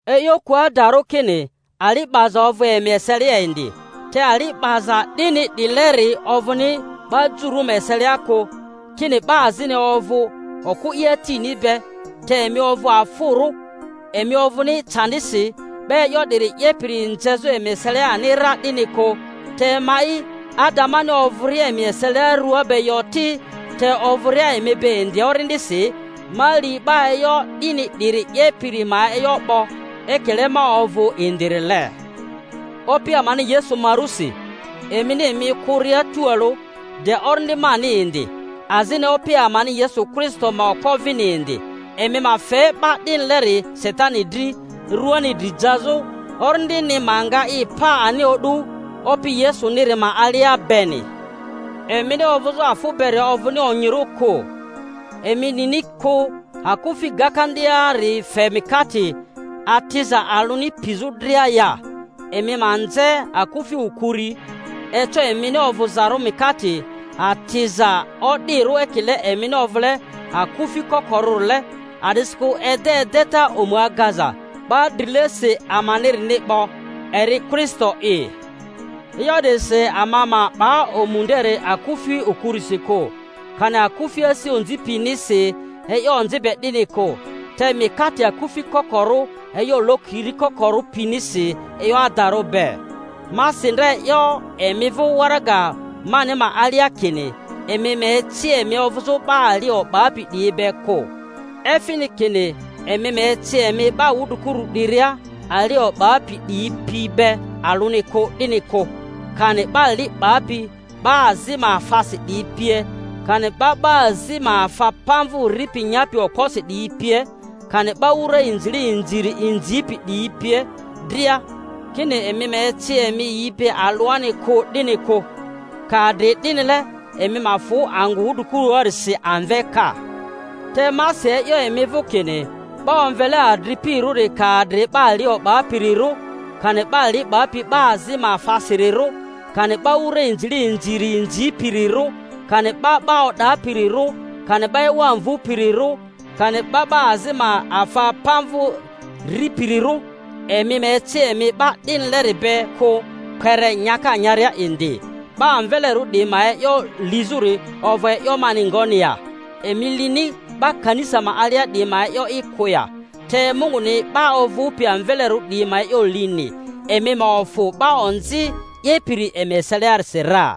E'yo ku adarᴜ kini ali 'baza ovᴜ emi eselia indi, te ali 'baza 'dini 'dileri ovᴜni 'ba jmurᴜ ma eselia kᴜ; kini 'ba azini ovᴜ okᴜ i atini be. Te emi ovᴜ afᴜrᴜ! Emi ovᴜni candisi, 'ba e'yo 'diri 'yepiri nzezᴜ emi eselia ani ra 'dini kᴜ. Te ma'i, ada, mani ovᴜria emi eselia rua be yo ti, te ovᴜria emi be indi orindisi, ma li 'ba e'yo 'dini 'diri 'yepiri ma e'yo 'bo, ekile ma ovᴜ indirile. Opi amani Yesu ma rusi, emini emi okᴜria tualᴜ, de orindi mani indi, azini Opi amani Yesu Kristo ma okpo vini indi, emi ma fe 'ba 'dinileri Satani dri ruani dri jazᴜ, orindini ma nga i pa ani o'du Opi Yesuniri ma alia beni. Emini ovᴜzᴜ afᴜ beri ovᴜni onyirᴜ kᴜ. Emi nini kᴜ, akufi gakandiari fe mikate atiza alᴜni pizᴜ dria ya? Emi ma nze akufi okuri, eco emini ovᴜzarᴜ mikate atiza o'dirᴜ, ekile emini ovᴜle akᴜfi kokorᴜrile. A'disikᴜ ede edeta omu agaza 'ba drilesi amanirini 'bo, eri Kristo'i. E'yo 'dirisi ama ma 'ba omu nderi akufi okurisi kᴜ, kani akufi asi onzi pinisi e'yo onzi be 'dini kᴜ, te mikate akufi kokorᴜ e'yo lokiri kokorᴜ pinisi e'yo adarᴜ be. Ma si ndra e'yo emi vᴜ waraga mani ma alia kini emi ma eci emi ovᴜzᴜ 'ba ali o'bapi 'diyi be kᴜ; efini kini emi ma eci emi 'ba wudrikuru 'diria ali o'bapi 'diyi pi be alᴜani kᴜ 'dini kᴜ, kani 'ba li 'bapi 'ba azi ma afasi 'diyi pie, kani 'ba 'ba azi ma afa pamvᴜ ripi nyapi okposi 'diyi pie, kani 'ba wura inzile inziri inzipi 'diyi pie dria, kini emi ma eci emi yi be alᴜani kᴜ 'dini kᴜ; ka adri 'dinile emi ma fᴜ angᴜ Wudrikuruarisi amve ka. Te ma si e'yo emi vᴜ kini 'ba omvele adripirᴜ ka adri 'ba ali o'bapirirᴜ, kani 'ba li 'bapi 'ba azi ma afasirirᴜ, kani 'ba wura inzile inziri inzipirirᴜ, kani 'ba 'ba o'dapirirᴜ, kani 'ba ewa mvᴜpirirᴜ, kani 'ba 'ba azi ma afa pamvᴜ ripirirᴜ—emi ma eci emi 'ba 'dinileri be kᴜ kpere nyaka nyaria indi. 'Ba amvelerᴜ 'diyi ma e'yo lizᴜri ovᴜ e'yo mani ngoni ya? Emi lini 'ba kanisa ma alia 'diyi ma e'yo'i kᴜ ya? Te Munguni 'ba ovᴜpi amvelerᴜ 'diyi ma e'yo lini. Emi ma ofᴜ 'ba onzi 'yepiri emi eseliasi ra.